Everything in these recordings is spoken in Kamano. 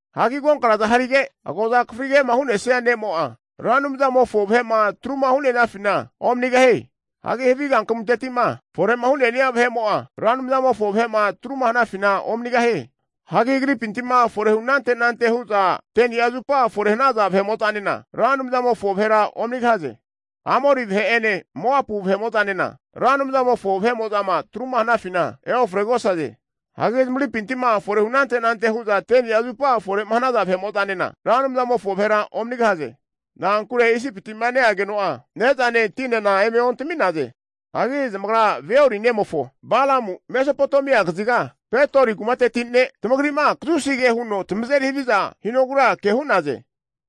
Hagi agonkna'za harige, agoza akafrige'ma hu'nesia ne'mo'a, Ra Anumzamofo vahe'ma atruma hu'ne'nafina omanigahie. Hagi havi kankamunteti'ma fore'ma hu'ne'ni'a vahe'mo'a, Ra Anumzamofo vahe'ma atruma hanafina omanigahie. Hagi agripinti fore hu anante anante hu'za 10ni'a zupa fore hanaza vahe'mo'zanena Ra Anumzamofo vahera omanigahaze. Amori vahe'ene Moapu vahe'mo'zanena Ra Anumzamofo vahe'mo'zama atru'ma hanafina eofregosaze. Hagi zamagripinti fore hu anante anante hu'za 10'a zupa fore hanaza vahe'mo'zanena, Ra Anumzamofo vahera omanigahaze. Na'ankure Isipiti'ma neageno'a ne'zane tinena eme ontami'naze. Hagi zamagra Beori nemofo Balamu Mesopotamia kaziga Petori kumateti ne' tamagri'ma kazusi ke huno tamazeri haviza hinogura ke hu'naze.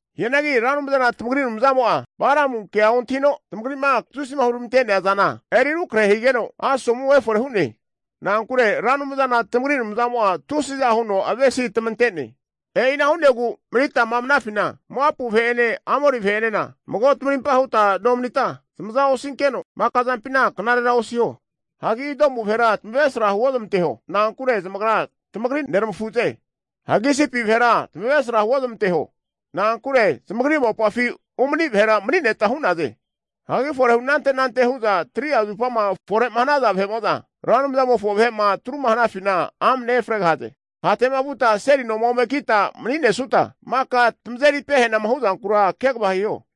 Hianagi Ra Anumzana tamagri Anumzamo'a Balamunkea ontahino, tamagri'ma kazusima huramantea zana eri rukrahe higeno, asomu efore hu'ne. Na'ankure Ra Anumzana tamagri Anumzamo'a tusiza huno avesi tamante'ne. E'ina hu'negu manitama vanafina, Moapu vahe'ene Amori vahe'enena mago tamarimpa huta nomanita zamaza osinke'za, maka zampina knarera osiho. Hagi Idomu vahera tamavresra huozamanteho. Na'ankure zamagra tamagri neramafuze. Hagi Isipi vahera tamavresra huozamanteho. Na'ankure zamagri mopafi umani vahera mani'neta hu'naze. Hagi fore hu anante anante hu'za 3'a zupama fore'ma hanaza vahe'mo'za, Ra Anumzamofo vahe'ma atruma hanafina amne efregahaze. Hate'ma vuta seli noma ome kita mani'nesuta, maka tamazeri pehanama hu'zankura kegava hiho.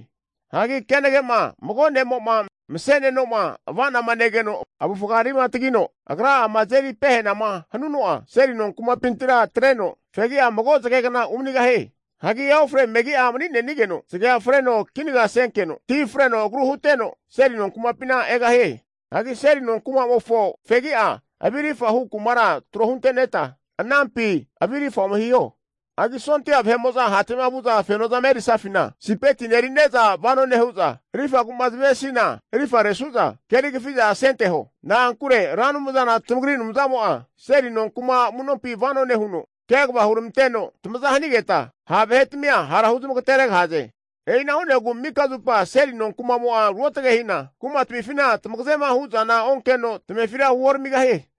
Hagi kenage'ma mago ne'mo'ma mase'neno'ma ava'nama negeno avufgarima tagi atreno agra'ama azeri pehanama hanuno'a, seli nonkumapintira atreno fegi'a mago zagegna umanigahie. Hagi eofre megi'a mani'nenigeno, zagea freno kinaga senkeno, tina freno agru huteno, seli nonkumapina egahie. Hagi seli nonkuma'mofo fegi'a avirifa hu kumara tro hunte'neta, anampi avirifa ome hiho. Hagi sondia vahe'mo'zama hate'ma vu'za fenozama erisafina, sipetine erine'za vano nehu'za, arifagu'ma zamavesina arifama resu'za keri kafi'za asenteho. Na'ankure Ra Anumzana tamagri Anumzamo'a seli nonku'ma amu'nompi vano nehuno, kegava huneramanteno tamaza hanigetma ha vahe'tmia hara huzmagateregahaze. E'ina hu'negu mika zupa seli nonkuma'mo'a ruotge hina, Ra Anumzamo'a kumatmifina tamagazema hu'zana onkeno, tamefira huoramigahie.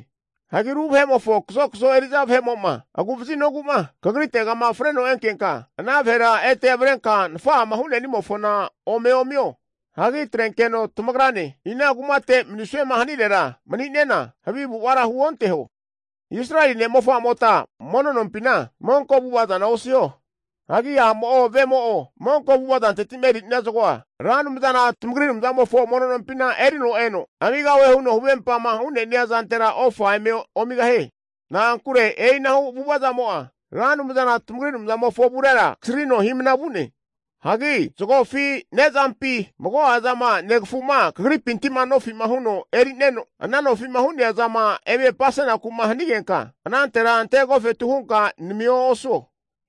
Hagi ru vahe'mofo kazokazo eri'za vahe'mo'ma, agu'vaziogu'ma kagritegama freno enkenka, ana vahera ete avrenka nafa'ama hu'ne'nimofona ome omio. Hagi atrenkeno tamagrane ina kumate manisuema hanirera mani'nena, havi avu'avara huonteho. Israeli vahe'mota mono nompina monko avu'ava zana osiho. Hagi a'mo'o vemo'o monko avu'avazanteti'ma eri'nia zagoa Ra Anumzana tamagri Anumzamofo mono nompina erino eno, amigahue huno huvempama hu'nenia zantera ofa eme omigahie. Na'ankure e'inahu avu'ava zamo'a Ra Anumzana tamagri Anumzamofo avurera kasrino hi'mna vu'ne. Hagi zagofi ne'zampi, mago'a zama negafu'ma kagripinti'ma nofi'ma huno emeri'neno, ana nofi'ma hu'nea zama eme apasenaku'ma nehanigenka, anantera ante agofetu hunka namio osuo.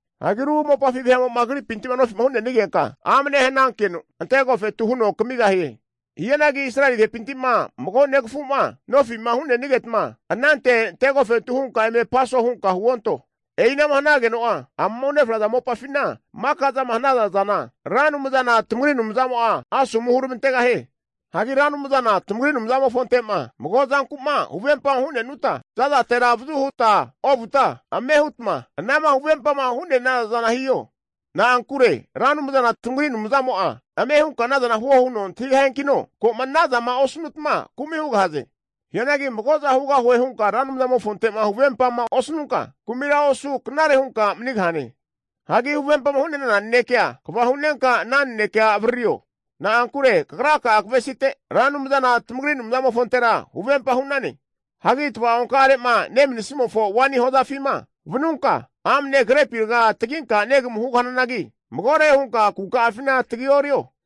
Ru mopafi vahe'mo'ma kagripinti'ma nofi'ma hu'nenigenka amne hanankeno, ante agofetu huno kamigahie. Hianagi Israeli vahepinti'ma mago negafu'ma nofi'ma hu'nenigetma, ante agofetu hunka eme apaso hunka huonto. E'ina'ma hanageno'a amama unefraza mopafina maka zama hanaza zana Ra Anumzana tamagri Anumzamo'a asomu huramantegahie. Hagi Ra Anumzana tamagri Anumzamofonte'ma mago'a zanku'ma huvempama hu'ne'nutma, za'zatera avazu huta ovuta ame hutma anama huvempama hu'ne'naza zana hiho. Na'ankure Ra Anumzana tamagri Anumzamo'a ame hunka anazana huo huno antahigahiankino, ko'ma anazama osnutma kumi hugahaze. Hianagi mago'za hugahue hunka Ra Anumzamofonte'ma huvempama osnunka, kumira osu knare hunka manigahane. Hagi huvempama hu'nenana nanekea kva hu'nenka ana nanekea avaririo. Na'ankure kagra'a kavesite Ra Anumzana tamagri Anumzamofontera huvempa hu'nane. Hagi tava'onka'are'ma nemanisimofo waini hozafima vanunka, amne grepi raga taginka negamu hugahananagi, magore hunka kuka'afina tagi orio.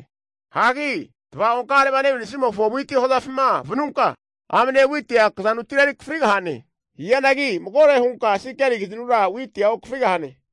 Hagi tava'onka'are'ma nemanisimofo witi hozafima vanunka, amne witia kazanutira eri akafrigahane. Hianagi magore hunka sekeli kazinura witia okafrigahane.